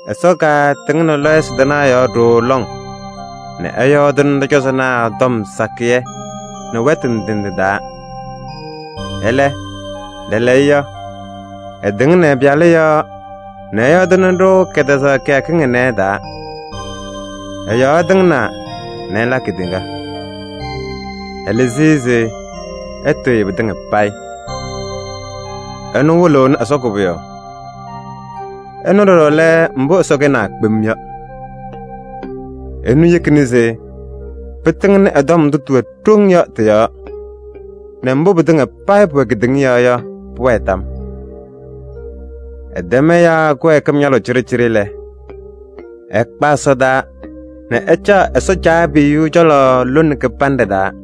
Ɛsɔ katɩŋnɩ lɔɔyɩsɩ tɩnaa yɔɔ ɖooo lɔŋ nɛ ɛyɔɔdɩnɩ ɖɔ-cɔzɔnaa tɔm sakɩyɛ nɛ wɛtʋ ndɩ ndɩ taa. Ɛlɛ, lɛɛlɛɛyɔ ɛtɩŋnɩ ɛ-Pɩyalʋ yɔɔ nɛ ɛyɔɔdɩnɩ-ɖʋ kɛtɛzaɣ kɩyakɩŋ ɩnɛ ɩ-taa. Ɛ-yɔɔ ɛtɩŋnaa nɛ ɛla kedeŋa. Ɛlɩzɩ-ɩ se ɛtɩɣyɩ pɩtɩŋa payɩ. Ɛnʋ wɩlɩɣnɩ Ɛsɔ koboyaɣ. Ɛnʋ ɖɔɖɔ lɛ mbʋ Ɛsɔ kɛnaa kpem yɔ. Ɛnʋ yekina se pɩtɩŋnɩ ɛ-tɔm ndʋ tɩwɛ ɖoŋ yɔ tɩ-yɔɔ nɛ mbʋ pɩtɩŋa payɩ pʋwɛ kedeŋa yɔɔ yɔ, pʋwɛɛ tam. Ɛtɛm ɛyaa kɩwɛɛkɩm ñalʋʋ cɩɖɩcɩɖɩ lɛ, ɛkpa ɛsɔdaa nɛ ɛcaɣ Ɛsɔ Caabiyuu cɔlɔ lone kɩbanɖɛ taa.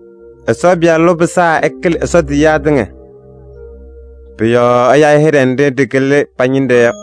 Ɛsɔ Pɩyalʋ pɩsaa ɛkɩlɩ Ɛsɔ tiyiyaa tɩŋa. Pʋ-yɔɔ ɛya-ɩ hɩɖɛ nɖɩ ɖɩkɩlɩ pa-ñɩnɖɛ yɔ.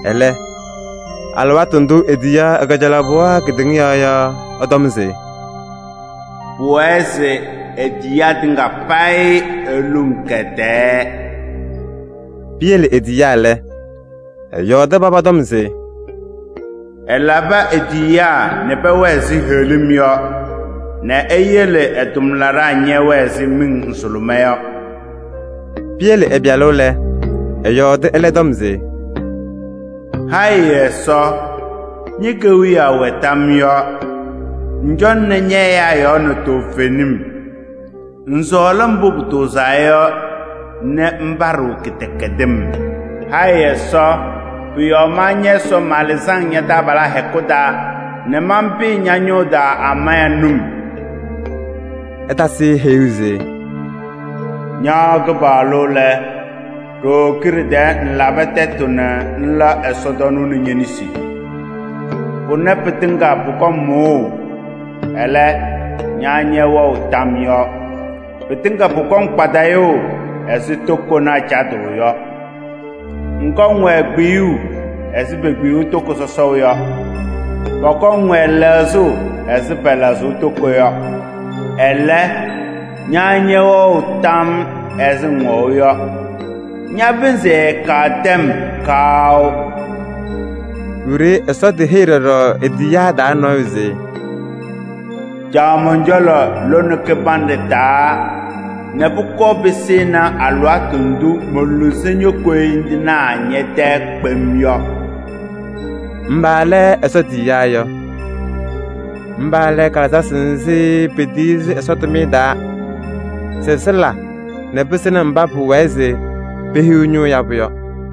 Ɛlɛ, alɩwaatʋ ndʋ etiyaɣ ɛ-kajalaɣ pɩɣa kedeŋa yɔɔ yɔ, ɛtɔm se: “Pʋwɛɛ se e-tiyiyaa tɩŋa payɩ eluŋ kɛ-tɛɛ.” Piyele e-tiyiyaa lɛ, ɛyɔɔdɩ paba tɔm se: “Ɛlabɩ e-tiyiyaa nɛ pɛwɛɛ ɛzɩ heɣlim yɔ nɛ eyele ɛ-tʋmlaɖaa ñɛwɛɛ ɛzɩ miŋ nzʋlʋmɛɛ yɔ.” Piyele ɛ-Pɩyalʋ lɛ, ɛyɔɔdɩ ɛlɛ tɔm se: “Hayɩ Ɛsɔ! Ñe-kewiyaɣ wɛ tam yɔɔ. Ŋcɔŋnɩ ñɛ-ɛyaa yɔɔ nɛ toovenim. Ŋsɔɔlɩ mbʋ pʋtʋʋzaa yɔ nɛ ŋpaɖɩɣ kɩdɛkɛdɩm. Hayɩ Ɛsɔ! Pʋ-yɔɔ ma ñɛ-Ɛsɔ malɩzɩ-ŋ ña-taabalaa hɛkʋ taa nɛ manpɩyɩ ña-ñʋʋ taa amaya num.” Ɛtasɩ-ɩ heyuu se: “Ña Kɩpaɣlʋ lɛ, ɖooo kiɖe tɛɛ ŋlabɩ tɛtʋ nɛ ŋla ɛsɔtɔnʋʋ nɛ ñe-nesi. Pʋnɛ pɩtɩŋa pʋkɔŋ mʋʋ. Ɛlɛ, ña ñɛwɛɣ tam yɔɔ. Pɩtɩŋa pʋkɔŋ kpadɩyʋʋ ɛzɩ tokonaa cadʋʋ yɔ. Ŋkɔŋ-wɛ kpiyuu ɛzɩ pekpiyuu toko sɔsɔʋ yɔ. Pɔkɔŋ-wɛ lɛɣzʋʋ ɛzɩ pɛlɛɣzʋʋ toko yɔ. Ɛlɛ, ña ñɛwɛɣ tam ɛzɩ ŋwɛʋ yɔ, ña-pɩnzɩ ɛɛkaɣ tɛm kaʋ.” Wiɖiyi Ɛsɔ teheyi ɖɔɖɔ e-tiyiyaa taa nɔɔyʋ se: “Caɣ mɔn-cɔlɔ lone kɩbanɖɛ taa nɛ pʋkɔɔ pɩsɩnɩ alɩwaatʋ ndʋ moluzi ño-koyindinaa ñɛ-tɛɛ kpem yɔ.” Mba lɛ Ɛsɔ tiyiyaa yɔ? Mba lɛ kalɩzasɩ nzɩ petiyi-sɩ Ɛsɔ tʋmɩyɛ taa se sɩlabɩ-ɖɩ nɛ pɩsɩnɩ mba pʋwɛɛ se pehiɣ ñʋʋ yabʋ yɔ.